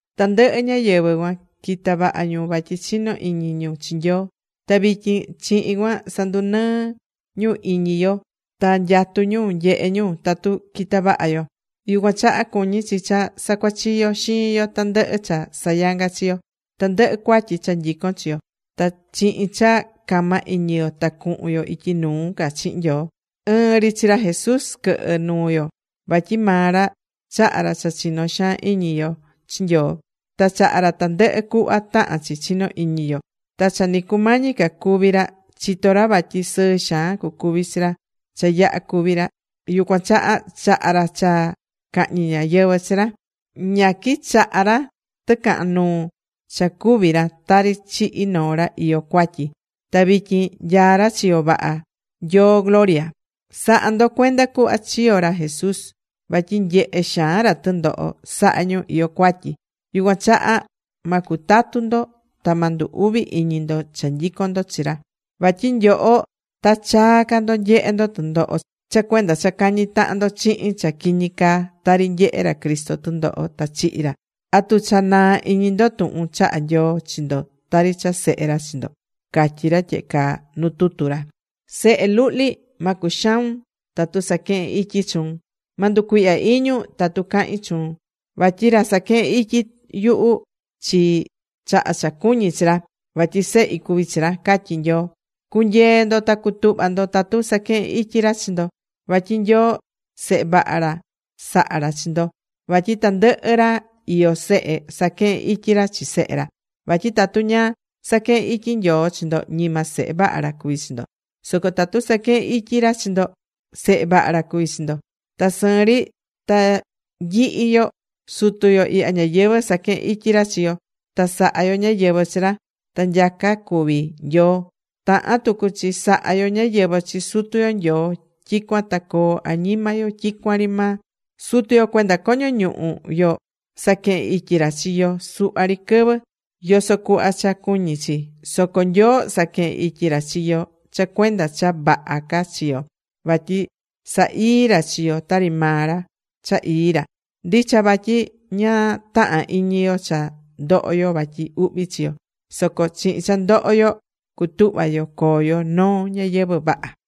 Tandɨhɨ ñáyɨvɨ cuan quita̱ vaha ñu vatyi chino̱ iñi ñu chi Nyoo. Ta vityin chihin cuan sandunɨɨ ñu iñi yo ta nyatú ñu nyehe ñu tatu quita vaha yo. Yucuan chaha cuñí chi cha sacuachiyo xiin yo tandɨhɨ cha sayangá chi yo, tandɨhɨ cuatyi cha nyicón chi yo. Ta chihin cha cama iñi yo ta cuhun yo ityi nuu ca chihin Nyoo. Ɨɨn ri chi ra Jesús quɨhɨ nuu yo, vatyi maa ra chaha̱ ra cha chinó xaan iñi yo chi Nyoo, ta chaha̱ ra tandɨhɨ cuhva tahán chi chino iñi yo. Ta cha ni cumañi ca cúvi ra, chitó ra vatyi sɨɨ xaan cucuvi chi ra cha yaha cúvi ra. Yucuan chaha, chaha̱ ra cha cahñi ñáyɨvɨ chi ra. Ña quichaha̱ ra tɨcahan nuu cha cúvi ra tari chihi noo ra iyó cuatyi, ta vityin nyaá ra chiyo vaha Nyoo gloria. Sa̱ha ndo cuenda cuhva chiyo̱ ra Jesús, vatyi nyehe̱ xaan ra tɨndoho saha̱ ñu iyó cuatyi. Yucuan chaha ma cutatu ndo, ta ma ndu uvi iñi ndo cha nyicón ndo chi ra. Vatyi nyoho ta chaa ca ndo nyehe ndo tɨndoho cha cuenda cha cañí tahan ndo chihin cha quiñi caa, tari nyehe̱ ra Cristo tɨndoho ta chihi̱ ra. ¿Atu cha naa̱ iñi ndo tuhun chaha̱ Nyoo chi ndo tari cha sehe ra chi ndo? Catyí ra tyehe caa nu tutu ra: Sehe luhli, ma cuxaun tatu saquehen ityi chuun. Ma nducuihya iñun tatu cahín chuun. Vatyi ra saquehén ityi yuhu chi, chaha cha cuñí chi ra, vatyi sehi cuví chi ra, catyí Nyoo. Cu̱nyee ndo ta cu̱tuhva ndo tatu saquehen ityi ra chi ndo, vatyi Nyoo, sehe vaha ra saha̱ ra chi ndo. Vatyi tandɨhɨ ra iyó sehe, saquehén ityi ra chi sehe ra. Vatyi tatu ña saquehén ityi Nyoo chi ndo, ñima sehe vaha ra cuví chi ndo, soco tatu saquehén ityi ra chi ndo, sehe vaha ra cuví chi ndo. Ta sɨɨn ri, ta nyihi yo, sutu yo ihya ñayɨvɨ̱ saquehe̱n ityi ra chi yo, ta saha̱ yo ñáyɨvɨ chi ra. Ta nyaca cuví Nyoo, tahán tucu chi saha yo ñáyɨvɨ chi Sutu yo Nyoo, tyicuan ta coo añima yo tyicuan ri maa. Sutu yo cuenda coño ñuhu yo, saquehe̱n ityi ra chi yo suhva ri quɨvɨ, yoso cuhva cha cuñi chi. Soco Nyoo saquehén ityi ra chi yo cha cuenda noo cha vaha ca chi yo, vatyi sa ii ra chi yo tari maa ra, cha ii ra. Ndicha vatyi ña tahán iñi yo cha ndohó yo vatyi uhvi chi yo. Soco chihin cha ndoho yo, cutuhva yo coo yo noo ñayɨvɨ̱ vaha.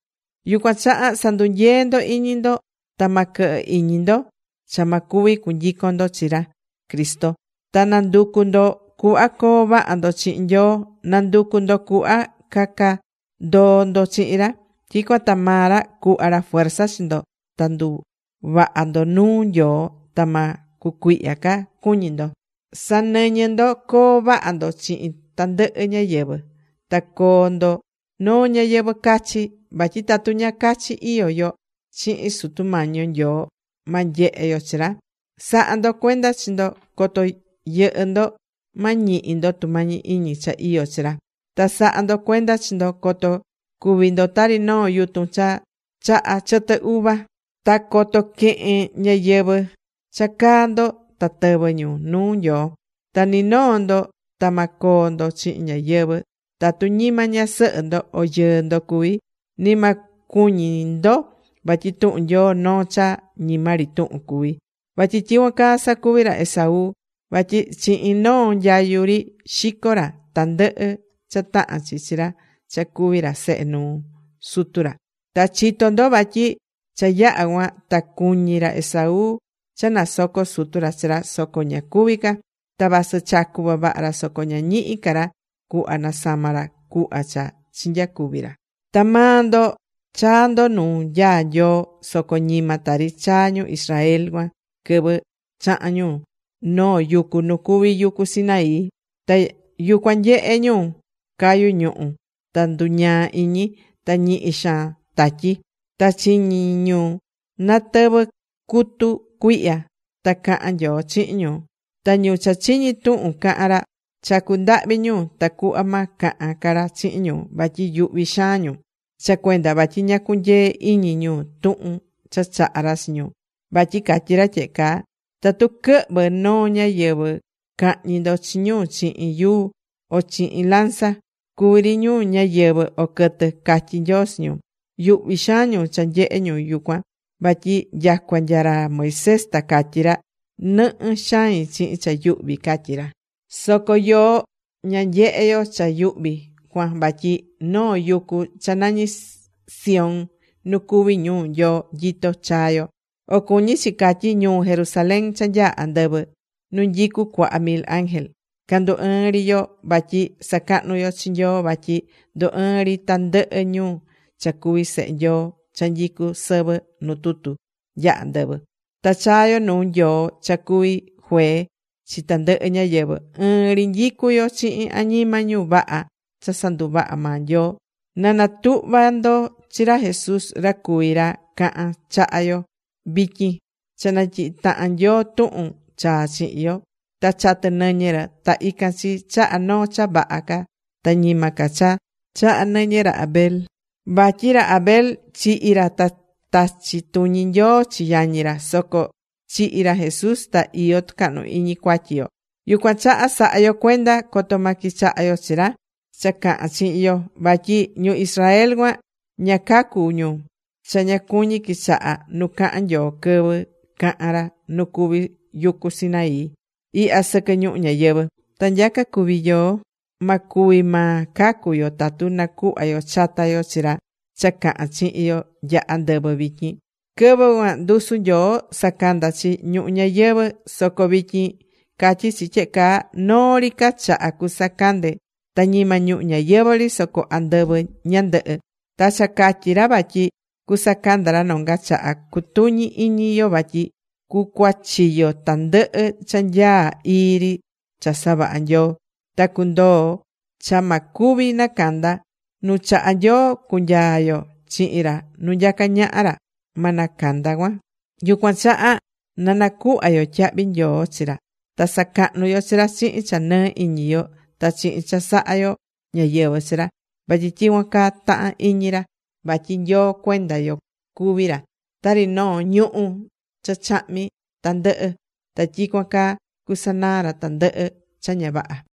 Yucuan chaha sa̱ndunyee ndo iñi ndo, ta ma quɨhɨ iñi ndo cha ma cuvi cunyicon ndo chi ra Cristo. Ta na̱nducu ndo cuhva coo vaha ndo chihin Nyoo, na̱nducu ndo cuhva caca ndoo ndo chihin ra. Tyicuan ta maa ra cuhva ra fuerza chi ndo ta nduvaha ndo nuu Nyoo ta ma cucuihya ca cuñí ndo. Sa̱nɨñɨ ndo coo vaha ndo chihin tandɨhɨ ñáyɨvɨ. Ta coo ndo noo ñayɨvɨ̱ cachi. Vatyi tatu ña cachi iyó yo, chihin Sutu Mañi yo Nyoo, ma nyehe yo chi ra. Sa̱ha ndo cuenda chi ndo coto yɨhɨ ndo, ma ñihi ndo tumañi iñi cha iyó chi ra. Ta sa̱ha ndo cuenda chi ndo, coto cuvi ndo tari noo yutun cha chahá chɨtɨ uva, ta coto quehen ñáyɨvɨ cha caá ndo ta tɨvɨ ñu nuu Nyoo. Ta ni noo ndo ta maa coo ndo chihin ñáyɨvɨ tatu ñima ñasɨhɨ ndo o yɨɨ ndo cuví. Ni ma cuñi ndo vatyi tuhun Nyoo noo cha ñima ri tuhun cuví, vatyi tyicuan caa sacuvi̱ ra Esaú, vatyi chihin noo nyayu ri, xico̱ ra tandɨhɨ cha tahán chi chi ra cha cuví ra sehe nuu sutu ra. Ta chitó ndo vatyi cha yaha cuan ta cuñi̱ ra Esaú cha nasoco sutu ra chi ra, soco ña cuvi̱ ca. Ta vasɨ chacu̱ vavaha ra, soco ña ñihi̱ ca ra cuhva nasama̱ ra cuhva cha chinyacuvi̱ ra. Ta maa ndo chaa̱ ndo nuu nyaá Nyoo soco ñima tari chaa̱ ñu Israel cuan quɨvɨ chaha̱n ñu noo yucu nu cuví yucu Sinaí. Ta yucuan nyehe̱ ñu cayu̱ ñuhu̱, ta nduñaa̱ iñi, ta ñihi xaan tatyi. Ta chiñi̱ ñu natɨvɨ cutu cuihya ta caha̱n Nyoo chihin ñu. Ta ñu cha chiñi̱ tuhun caha̱n ra, chacu̱ ndahvi ñu tacuhva ma cahan ca ra chihin ñu, vatyi yuhvi xaan ñu cha cuenda vatyi ña cunyee̱ iñi ñu tuhun cha chaha̱ ra chi ñu. Vatyi catyí ra tyehe caa: “Tatu quɨhvɨ noo ñáyɨvɨ, ca̱hñi ndo chi ñu chihin yuu o chihin lanza, cuví ri ñu ñáyɨvɨ o quɨtɨ”, catyí Nyoo chi ñu. Yuhvi xaan ñu cha nyehé ñu yucuan, vatyi nyacua nya ra Moisés ta catyí ra: “Nɨhɨ xain chihin cha yuhví”, catyí ra. Soco yoó ña nyehe̱ yo cha yuhvi cuan vatyi noo yucu cha nañí Sión nu cuví ñuu Nyoo nyitó chaa̱ yo. O cuñi chi catyí ñuu Jerusalén cha nyaá andɨvɨ, nu nyicú cuaha mil ángel. Candú ɨɨn ri yo vatyi sacahnu yo chi Nyoo vatyi ndú ɨɨn ri tandɨhɨ ñu cha cuví sehe Nyoo cha nyicú sɨvɨ nu tutu nya andɨvɨ. Ta chaa yo nuu Nyoo cha cuví juee chi tandɨhɨ ñáyɨvɨ. Ɨɨn ri nyicú yo chihin añima ñu vaha cha sanduvaha̱ maa Nyoo. Ta natuhva̱ ndo chi ra Jesús ra cuví ra cahán chaha yo vityin cha natyihi̱ tahan Nyoo tuhun chaa chihin yo. Ta chatɨ̱ nɨñɨ ra. Ta ican chi chahá noo cha vaha ca ta ñima ca cha chahá nɨñɨ ra Abel. (Vatyi ra Abel chihi̱ ra ta tachi̱ tuñi Nyoo chi yañi ra. Soco chihi̱ ra Jesús, ta iyó tucahnu iñi cuatyi yo.) Yucuan chaha sa̱ha yo cuenda coto ma quichaha yo chi ra cha cahán chihin yo. Vatyi ñu Israel cuan, ña cacu̱ ñu cha ña cuñí quichaha nu cahan Nyoo quɨvɨ caha̱n ra nu cuví yucu Sinaí ihya sɨquɨ ñuhu ñayɨvɨ̱. Ta nyaca cuví yoó, ma cuvi maa cacu yo tatu nacuhva yo chata yo chi ra cha cahán chihin yo nya andɨvɨ vityin. Quɨvɨ cuan ndusu Nyoo sacanda̱ chi ñuhu ñayɨvɨ̱. Soco vityin catyí chi tyehe caa: “Noo ri ca chaha cusacande ta ñima ñuhu ñayɨvɨ̱ ri, soco andɨvɨ ñandɨhɨ.” Ta cha catyí ra vatyi cusacanda ra nonga chaha, cutuñi iñi yo vatyi cucuachiyo tandɨhɨ cha nyaá ii ri cha savaha̱ Nyoo. Ta cundoo cha ma cuvi nacanda. Nu chahá Nyoo cunyaa yo chihin ra nu nyacá ñaha ra, ma nacanda cuan. Yucuan chaha na nacuhva yo tyahvi nyoo chi ra, ta sacahnu yo chi ra chihin cha nɨɨ iñi yo, ta chihin cha saha yo ñáyɨvɨ chi ra, vatyi tyicuan caa tahán iñi ra. Vatyi Nyoo cuenda yo, cuví ra tari noo ñuhú cha chahmí tandɨhɨ, ta tyicuan caa cusanaa ra tandɨhɨ cha ña vaha.